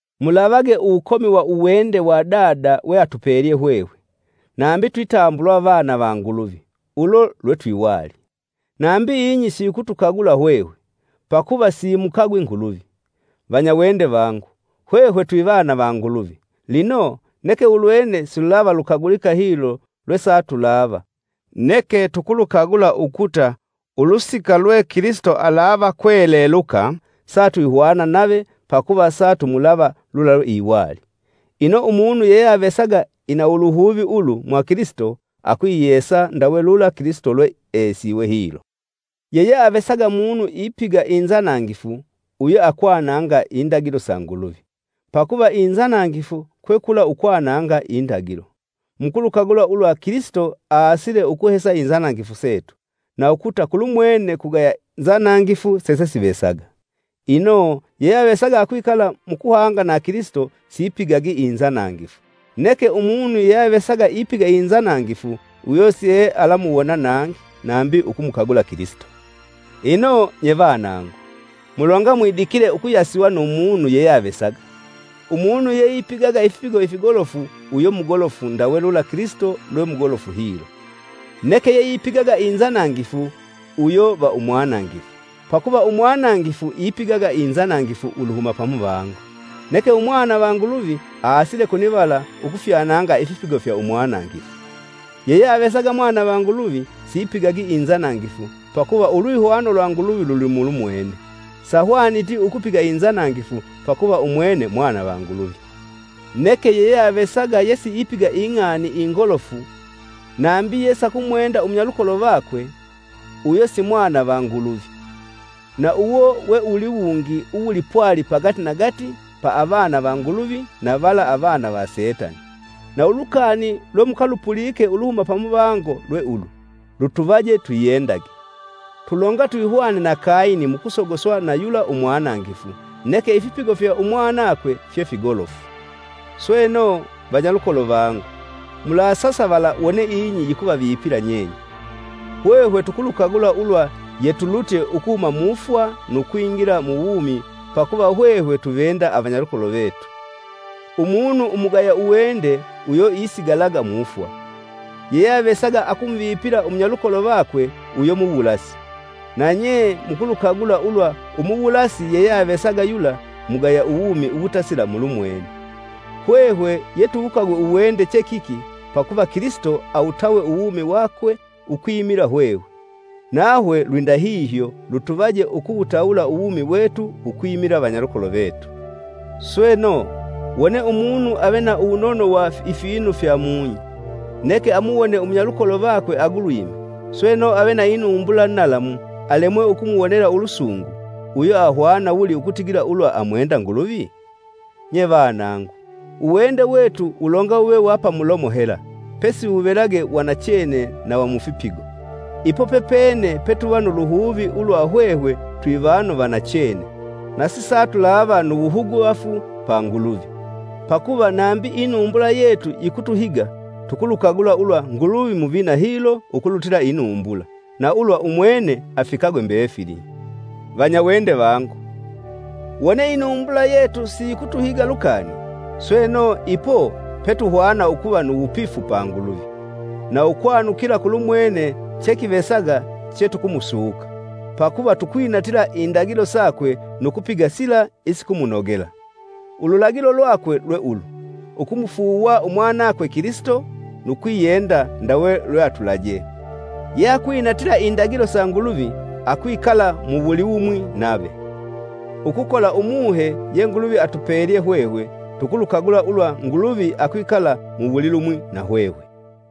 Mulavage ndawuli uwende wa Dada weatupelye hwehwe, nambi twitambulwa vana va Nguluvi, ulo lwe twiwali. Nambi ing'i siyikutukagula hwehwe, pakuva siyimukagwi Nguluvi. Vanyawende vangu, hwehwe twivana va Nguluvi lino, neke ulwene silulava lukagulika hilo lwesatulava. Neke tukulukagula ukuta, ulusika lwe Kilisito alava kweleluka, satwihwana nave pakuva satumulava lula lweiwali. Ino, umunu yeyeavesaga ina uluhuvi ulu mwa Kilisito, akwiyesa ndawe lula Kilisito lweesiwe hilo. Yeyeavesaga munu ipiga inzanangifu uyo akwananga indagilo sa Nguluvi, pakuva inzanangifu kwe kula ukwananga indagilo. Mukulukagula ulwa Kilisito aasile ukuhesa inzanangifu setu, na ukuta kulumwene kugaya nzanangifu sesesivesaga. Ino, yeyeavesaga akwikala mukuhanga na Kilisito sipigagi inzanangifu; neke umunu yeyeavesaga ipiga inzanangifu uyo siealamwuwona nangi nambi ukumukagula Kilisito. Ino, nye vanangu, mulonga mwidikile ukuyasiwa nu munu yeyeavesaga. Umunu yeipigaga ifipigo ifigolofu uyo mugolofu ndawe lula Kilisito lwe mugolofu hilo. Neke yeipigaga inzanangifu uyo va umwanangifu, pakuva umwanangifu ipigaga inzanangifu uluhuma pamuvango. Neke Umwana va Nguluvi aasile konivala ukufyananga ifipigo fya umwanangifu. Yeyeavesaga mwana va Nguluvi sipigagi inzanangifu, pakuva ulwihwano lwa Nguluvi luli mulumwene; sahwaniti ukupiga inzanangifu pakuva umwene mwana va Nguluvi. Neke yeyeavesaga yesiipiga ing'ani ingolofu, nambi yesakumwenda umunyalukolo vakwe, uyo si mwana va Nguluvi. Na uwo we uwuliwungi uwipwali pagatinagati pa avana va Nguluvi na vala avana va setani. Na ulukani lwemukalupulike uluhuma pamuvango lwe ulu: Lutuvaje twiyendage! Tulonga twihwane na Kayini mu kusogoswa na yula umwanangifu, neke ifipigo fya umwanakwe fye figolofu! Sweno, vanyalukolo vangu, mulasasavala wone ing'i yikuvavipila nyenye. Hwehwe tukulukagula ulwa yetulutye ukuhuma mufwa nu kwingila muwumi pakuva hwehwe tuvenda avanyalukolo vetu. Umunu umugaya uwende uyo isigalaga mufwa. Yeyeavesaga akumuvipila umunyalukolo vakwe uyo muwulasi; nanye mukulukagula ulwa umuwulasi yeyeavesaga yula mugaya uwumi uwutasila mulumwene. Hwehwe yetuwukagwe uwende che kiki, pakuva Kilisito awutawe uwumi wakwe ukwimila hwehwe. Nahwe lwindahihyo lutuvaje ukuwutawula uwumi wetu ukwimila vanyalukolo vetu. Sweno, wone umunu ave na uwunono wa ifinu fyamung'i, neke amuwone umunyalukolo vakwe agulwime, sweno ave na inumbula nalamu alemwe akumuwonela ulusungu, uyo ahwana wuli ukutigila ulwa amwenda Nguluvi? Nye vanangu, uwende wetu wulonga wuve wa pamulomo hela, pesi wuvelage wa nachene na wa mufipigo. Ipo pepene petuva nu luhuvi ulwa hwehwe twivanu va nachene; na sisatulava nu wuhuguvafu pa Nguluvi. Pakuva, nambi inumbula yetu yikutuhiga, tukulukagula ulwa Nguluvi muvina hilo ukulutila inumbula, na ulwa umwene afikagwe mbefili. Vanyawende vangu, wone inumbula yetu siyikutuhiga lukani, sweno, ipo petuhwana ukuva nu wupifu pa Nguluvi, na ukwanukila kulumwene chekivesaga chetukumusuka, pakuva tukwinatila indagilo sakwe nu kupiga sila isikumunogela. Ululagilo lwakwe lwe ulu: Ukumufuuwa umwanakwe Kilisito, nu kwiyenda ndawe lweatulajee. Yeakwinatila indagilo sa Nguluvi akwikala mu wulilumwi nave. Ukukola Umuhe ye Nguluvi atupelye hwehwe, tukulukagula ulwa Nguluvi akwikala muwulilumwi na hwehwe.